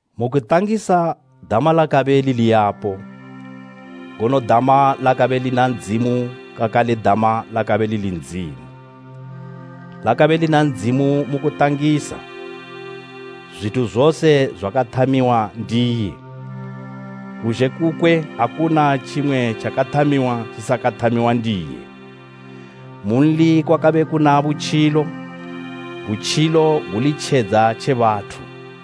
Mu kutangisa Dama lakabe lili yapo, ngono Dama lakabe lina Ndzimu kakale Dama lakabe lili Ndzimu. Lakabe lina Ndzimu mu kutangisa. Zwithu zose zwakathamiwa ndiye. Kuzhe kukwe akuna tjimwe tjakathamiwa tjisakathamiwa ndiye. Munli kwakabe kuna butjilo, butjilo guli tjedza tje bathu.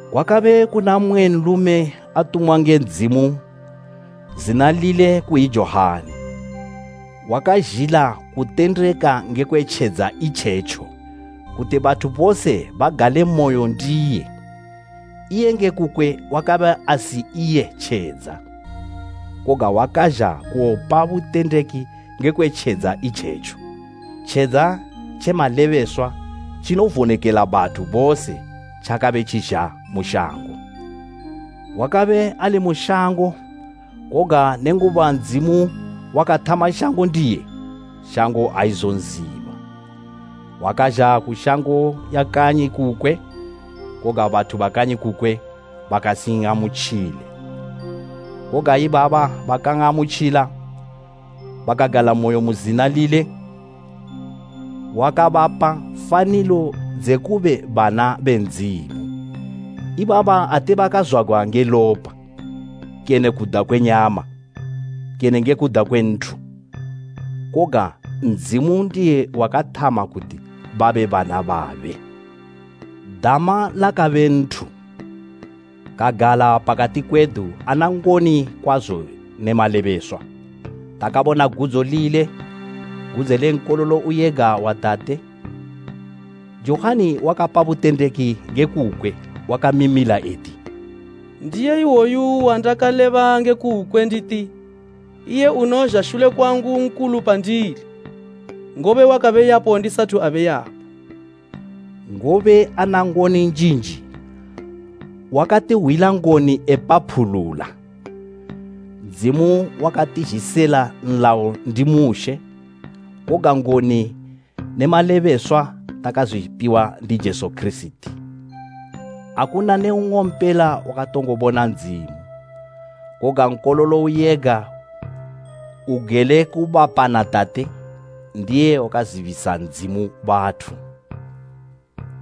Kwakabe kuna mmwe nlume atumwa nge Ndzimu, zina lile kuyi Johani, wakazhila kutendeka ngekwe tjedza itjetjo, kuti bathu bose bagalemoyo ndiye. Iye nge kukwe wakabe asi iye tjedza, koga, wakazha kuwopa butendeki ngekwe tjedza itjetjo. Tjedza tje malebeswa tjinovonekela bathu bose tjakabe tjizha mu shango. Wakabe ali mu shango, koga nenguba Ndzimu wakathama shango ndiye, shango aizonziba. Wakazha ku shango ya kanyi kukwe koga bathu ba kanyi kukwe bakasin'amutjile. Koga ibabo bakan'amutjila, bakagalamoyo mu zina lile, wakabapa fanilo dze kube bana be Ndzimu. Ibaba ate bakazwagwa nge lopa kene kuda kwe nyama, kene nge kuda kwe nthu, koga Ndzimu ndiye wakathama kuti babe bana babe. Dama lakabe nthu, kagala pakati kwedu ana ngoni kwazo ne malebeswa. Takabona gudzo lile, gudzo le Nkololo uyega wa Tate. Johani wakapa butendeki nge kukwe, wakamimila eti, “Ndiye iwoyu wandakaleba nge kukwe nditi, ‘Iye unozha shule kwangu nkulu pandili, ngobe wakabe yapo ndi sathu abe yapo.’” Ngobe ana ngoni njinji, wakatihwila ngoni epaphulula. Ndzimu wakatizhisila nlayo ndi Mushe, koga ngoni ne malebeswa takazwipiwa ndi Jesu Kirisiti. Akuna ne nng'ompela wakatongo bona Ndzimu. Koga Nkololo uyega, ugele kubapa na Tate, ndiye wakazibisa Ndzimu bathu.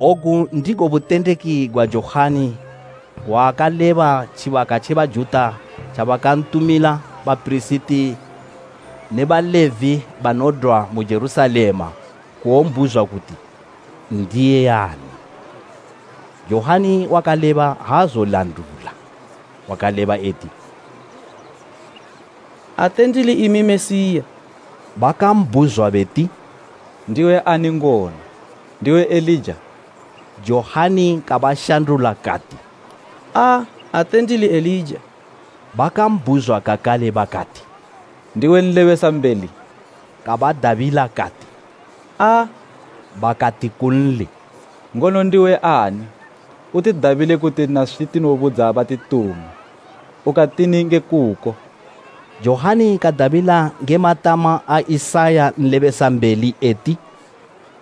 Ogu ndigo butendeki gwa Johani gwa akaleba tjibaka tje Bajuta tjabakantumila bapirisiti ne Balevi banodwa mu Jerusalema kuwombhuzwa kuti n'diyi ani. Johani wakaleba, aazozwilandula; wakaleba eti, “Ate ndili imi Mesiya.” Bakambhuzwa beti, “Ndiwe ani ngono? Ndiwe Elija?” Johani kabashandula kati, “Aa, ate ndili Elija.” Bakambhuzwa kakale bakati, “Ndiwe Nlebesambeli?” Kabadabila kati, “Aa.” Bakati kunli, “Ngono ndiwe ani? Utidabile kuti naswi tinobudza batituma. Ukatini nge kuko?” Johani kadabila nge matama a Isaya nlebesambeli eti,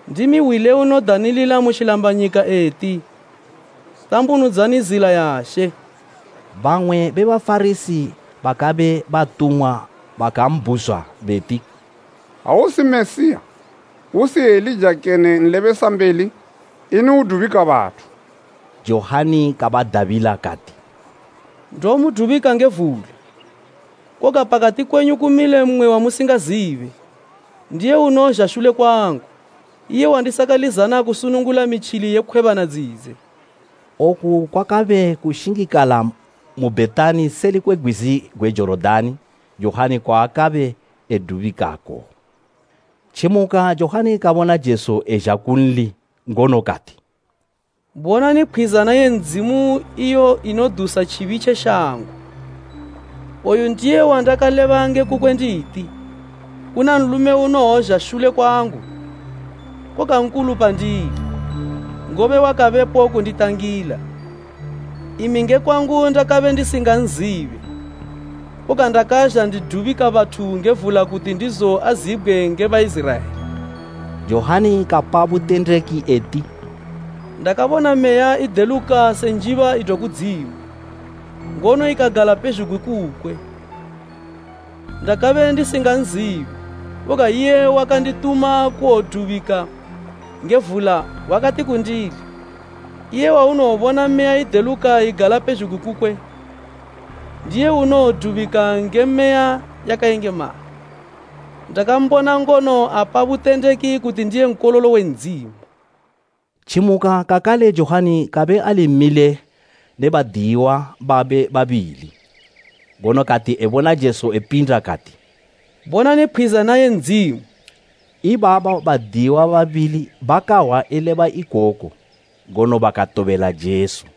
“Ndimi hwi le unodanilila mu tjilambanyika eti, ‘Tambunudzani zila ya She.’” Bamwe be Bafarasi, bakabe batumwa baka mbhuzwa beti, “Ha usi Mesiya, usi Elija kene nlebesambeli, ini udubika bathu?” Johani kabadabila kati, “Ndomudubika nge vula, koga pakati kwenyu kumile mmwe wamusingazibe. Ndiye unozha shule kwangu, iye wandisakalizana kusunungula mitjili ye khwebana dzidze.” Oku kwakabe kushingikala mu Bhetani seli kwe gwizi gwe Jorodani, Johani kwaakabe edubikako. Tjimuka, Johani kabona Jesu ezha kunli, ngono kati, “Bonani Pkhwizana ye Ndzimu iyo inodusa tjibi tje shango! Oyu ndiye wandakaleba nge kukwe nditi, ‘Kuna nlume unowozha shule kwangu, koga nkulu pandili, ngobe wakabepo kunditangila.’ Imi nge kwangu ndakabe ndisinganzibe, koga ndakazha ndidubika bathu nge vula kuti ndizo azibgwe nge Baiziraela.” Johani kapa butendeki eti, “Ndakabona Meya ideluka se njiba idwa kudzimu, ngono ikagala pezhugwi kukwe. Ndakabe ndisinganzibe, koga iye wakandituma kuwodubika nge vula wakati kundili, ‘Iye waunowobona Meya ideluka igala pezhugwi kukwe, ndiye unowodubika nge Meya yakayengemala.’ Ndakambona ngono apa butendeki kuti ndiye Nkololo we Ndzimu.” Tjimuka kakale Johani kabe ali mile ne badiyiwa babe babili, ngono kati ebona Jesu epinda kati, “Bonani Pkhwizana ye Ndzimu!” Ibabo badiyiwa babili bakahwa eleba ikoku, ngono bakatobela Jesu.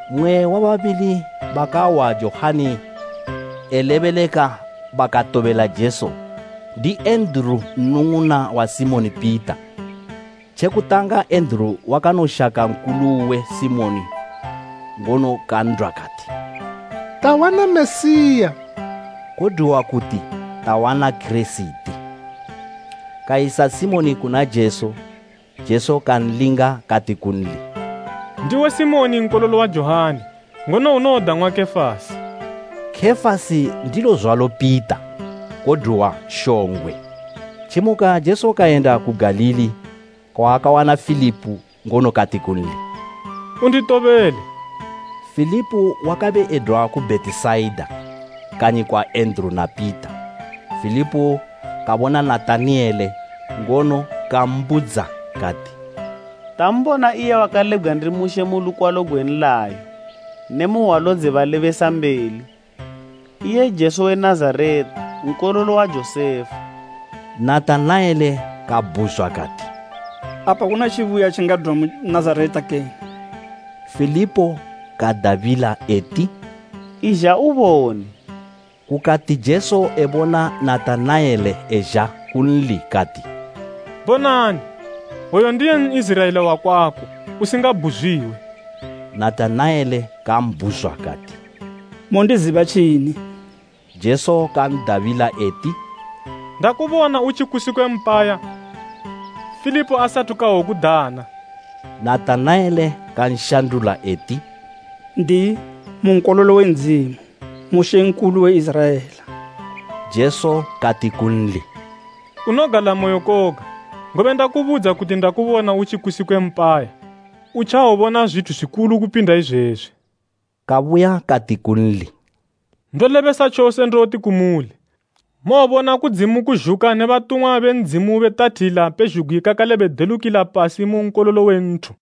Mmwe we babili bakahwa Johani elebeleka bakatobela Jesu ndi Enduru nnung'una wa Simoni Pita. Tje kutanga Enduru wakanoshaka nkulu uwe Simoni ngono kan'dwa kati, “Tawana Mesiya” Kodwiwa kuti Kirisiti. Kayisa Simoni kuna Jesu. Jesu kanlinga kati kunli, “Ndiwe Simoni nkololo wa Johani ngono unowodang'wa Kefasi.” Kefasi ndilo zwalo Pita, kodwiwa shongwe. Tjimuka Jesu kayenda ku Galili. Kawana Filipo ngono kati kunli, “Unditobele!” Filipo wakabe edwa ku Bhetisaida, kanyi kwa Enduru na Pita. Filipo kabona Natanaele ngono kambudza kati, “Tambona iye wakalebgwa ndi Mushe mu lukwalo gwe nlayo ne mu hwalo dze balebesambeli. Iye Jesu we Nazareta nkololo wa Josefa.” Natanaele kabhuzwa kati, “Apa kuna tjibuya tjingadwa mu Nazareta kene?” Filipo kadabila eti, “Izha ubone.” Kukati Jesu ebona Natanaele ezha kunli, kati, “Bonani, woyu ndiye N'iziraela wakwako, usingabhuzwiwe.” Natanaele kambhuzwa kati, “Mondiziba tjini?” Jesu kan'dabila eti, “Ndakubona utjikusi kwe mpaya, Filipo asathu kawokudana.” Natanaele kanshandula eti, “N'diyi, mu Nkololo we Ndzimu, mu Mambo we Iziraela!” Jesu kati kunli, “Unogalamoyo koga, ngobe ndakubudza kuti ndakubona utjikusi kwe mpaya. Utjawobona zwithu zwikulu kupinda izwezwi!” Kabuya kati kunli, “Ndolebesa tjose ndoti kumuli, mowobona kudzimu kuzhuka ne batumwa be Ndzimu betathila pezhugwi kakale bedelukila pasi mu Nkololo we nthu.”